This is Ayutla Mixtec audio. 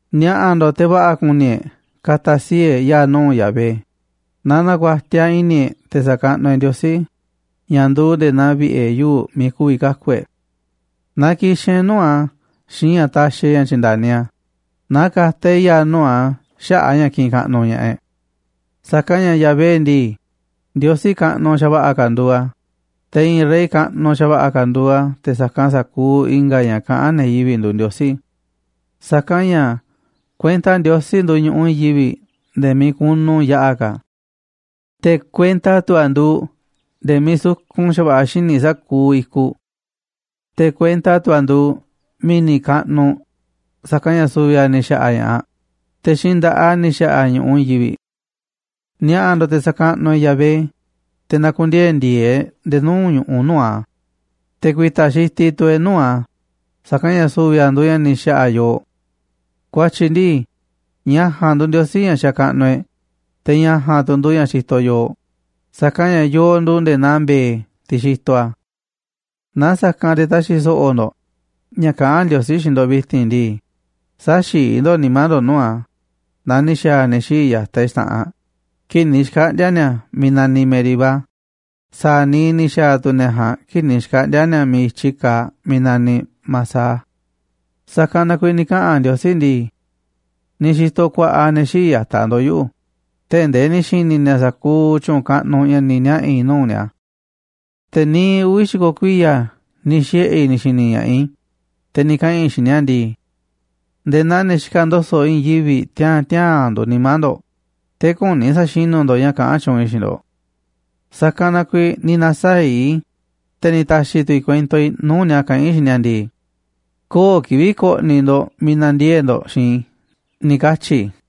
Ni̱a̱ꞌa̱ ndo̱ꞌ, te̱ va̱ꞌa̱ kuni e̱ꞌ ka̱ta̱ sii̱ꞌ e̱ꞌ ya̱a̱ nuu̱ꞌ Yahvé, na ku̱a̱tiaꞌ i̱ni̱ e̱ꞌ te̱ sa̱kaꞌnuꞌ e̱ꞌ Ndiosí ña̱ nduuꞌ nde̱e̱ naa vi̱ꞌe̱ yuu̱ꞌ miiꞌ ku̱vi̱ kaku̱ e̱ꞌ. Na ki̱xi̱n e̱ꞌ nuu̱ꞌ a̱ xiinꞌ ña̱ taxiꞌ e̱ꞌ ña̱ tyi̱nda̱ni a̱, na ka̱ta̱ e̱ꞌ ya̱a̱ nuu̱ꞌ a̱ xaꞌa̱ꞌ a̱ ña̱ kiꞌinꞌ kaꞌnuꞌ ña̱ꞌaꞌ e̱ꞌ. Sa̱kanꞌ ña̱ Yahvé ndii, Ndiosí kaꞌnuꞌ xa̱va̱ꞌa̱ ka̱ nduuꞌ a̱, te̱ i̱i̱n rey kaꞌnuꞌ xa̱va̱ꞌa̱ ka̱ nduuꞌ a̱ te̱ sa̱kanꞌ sa̱kuuꞌ i̱nga̱ ña̱ kaꞌán ne̱ yivi̱ꞌ nduuꞌ ndiosí. Sa̱kanꞌ ña̱ kuenta Ndiosí nduuꞌ ñu̱ꞌuꞌ i̱i̱n yivi̱ꞌ nde̱e̱ miiꞌ kunu yaꞌa̱ ka̱, te̱ kuenta tu̱ a̱ nduuꞌ nde̱e̱ miiꞌ sukun xa̱va̱ꞌa̱ xíniꞌ sa̱kuuꞌ i̱kuꞌ. Te̱ kuenta tu̱ a̱ nduuꞌ mi̱ni̱ kaꞌnuꞌ, sa̱kanꞌ ña̱ su̱vi̱ a̱ ni̱ xa̱ꞌa̱ ña̱ꞌaꞌ, te̱ xiinꞌ nda̱ꞌaꞌ a̱ ni̱ xa̱ꞌa̱ a̱ ñu̱ꞌuꞌ i̱i̱n yivi̱ꞌ. Ni̱a̱ꞌa̱ ndo̱ꞌ, te̱ sa̱kaꞌnuꞌ e̱ꞌ Yahvé, te̱ na̱ku̱ndiee̱ ndi̱e̱e̱ e̱ꞌ nde̱e̱ nuu̱ꞌ ñu̱ꞌuꞌ nuu̱ꞌ a̱, te̱ ku̱i̱ta̱ xitiꞌ tu̱ e̱ꞌ nuu̱ꞌ a̱, sa̱kanꞌ ña̱ su̱vi̱ a̱ nduuꞌ ña̱ ni̱ xa̱ꞌa̱ yooꞌ. Ku̱a̱tyi̱ ndi̱i, ña̱ ja̱a̱nꞌ nduuꞌ Ndiosí ña̱ xakaꞌnuꞌ e̱ꞌ, te̱ ña̱ ja̱a̱nꞌ tu̱ nduuꞌ ña̱ xitoꞌ yooꞌ, sa̱kanꞌ ña̱ yooꞌ nduuꞌ nde̱e̱ naa mbe̱e̱, tiꞌ xitoꞌ a̱. Naaꞌ sa̱kanꞌ te̱ ta̱xi̱ so̱ꞌo̱ ndo̱ꞌ ña̱ kaꞌán Ndiosí xiinꞌ ndo̱ꞌ vi̱ti̱n ndii, sä̱xi̱i̱ ndo̱ꞌ nimá ndo̱ꞌ nuu̱ꞌ a̱ naa ni̱ xa̱a̱ ne̱ xii̱ꞌ ya̱taꞌ e̱ꞌ xta̱ꞌanꞌ kii̱ꞌ ni̱ xkaꞌndi̱a̱ ni̱a̱ miiꞌ naniꞌ Meribá, sa̱a̱ niiꞌ ni̱ xa̱a̱ tu̱ ne̱ ja̱a̱nꞌ kii̱ꞌ ni̱ xkaꞌndi̱a̱ ni̱a̱ miiꞌ i̱tyi kaaꞌ miiꞌ naniꞌ Masah. Sa̱kanꞌ na kuiiꞌ ni̱ kaꞌa̱n Ndiosí ndii: “Ni̱ xi̱to̱ ku̱a̱ꞌa̱ ne̱ xii̱ꞌ ya̱taꞌ ndo̱ꞌ yuꞌu̱, tee̱ꞌ ndee ni̱ xi̱ni̱ ni̱a̱ sa̱kuuꞌ tyu̱u̱n kaꞌnuꞌ ña̱ ni̱ niaꞌa̱ i̱ nuu̱ꞌ ni̱a̱. Te̱ niiꞌ uvi̱ xi̱ko̱ kuiya̱ ni̱ xiꞌe̱ i̱ ni̱ xi̱ni̱ ña̱ꞌaꞌ i̱, te̱ ni̱ kaꞌa̱n i̱ xiinꞌ ni̱a̱ ndii: ‘Nde̱e̱ naa ne̱ xikaꞌ ndo̱so̱ꞌ i̱i̱n yivi̱ꞌ tiaa̱n tiaa̱n nduuꞌ nimá ndo̱ꞌ, te̱ küni sa̱xinú ndo̱ꞌ ña̱ kaꞌán tyuunꞌ i̱ xiinꞌ ndo̱ꞌ’. Sa̱kanꞌ na kuiiꞌ ni̱ na̱saa̱ꞌ i̱, te̱ ni̱ ta̱xi̱ tu̱ i̱ kuento i̱ nuu̱ꞌ ni̱a̱ kaꞌán i̱ xiinꞌ ni̱a̱ ndii: ‘Köo̱ꞌ kivi̱ꞌ ko̱ꞌni̱ ndo̱ꞌ miiꞌ na̱ndiee̱ꞌ ndo̱ꞌ xiinꞌ i̱’, ni̱ katyi̱ i̱.”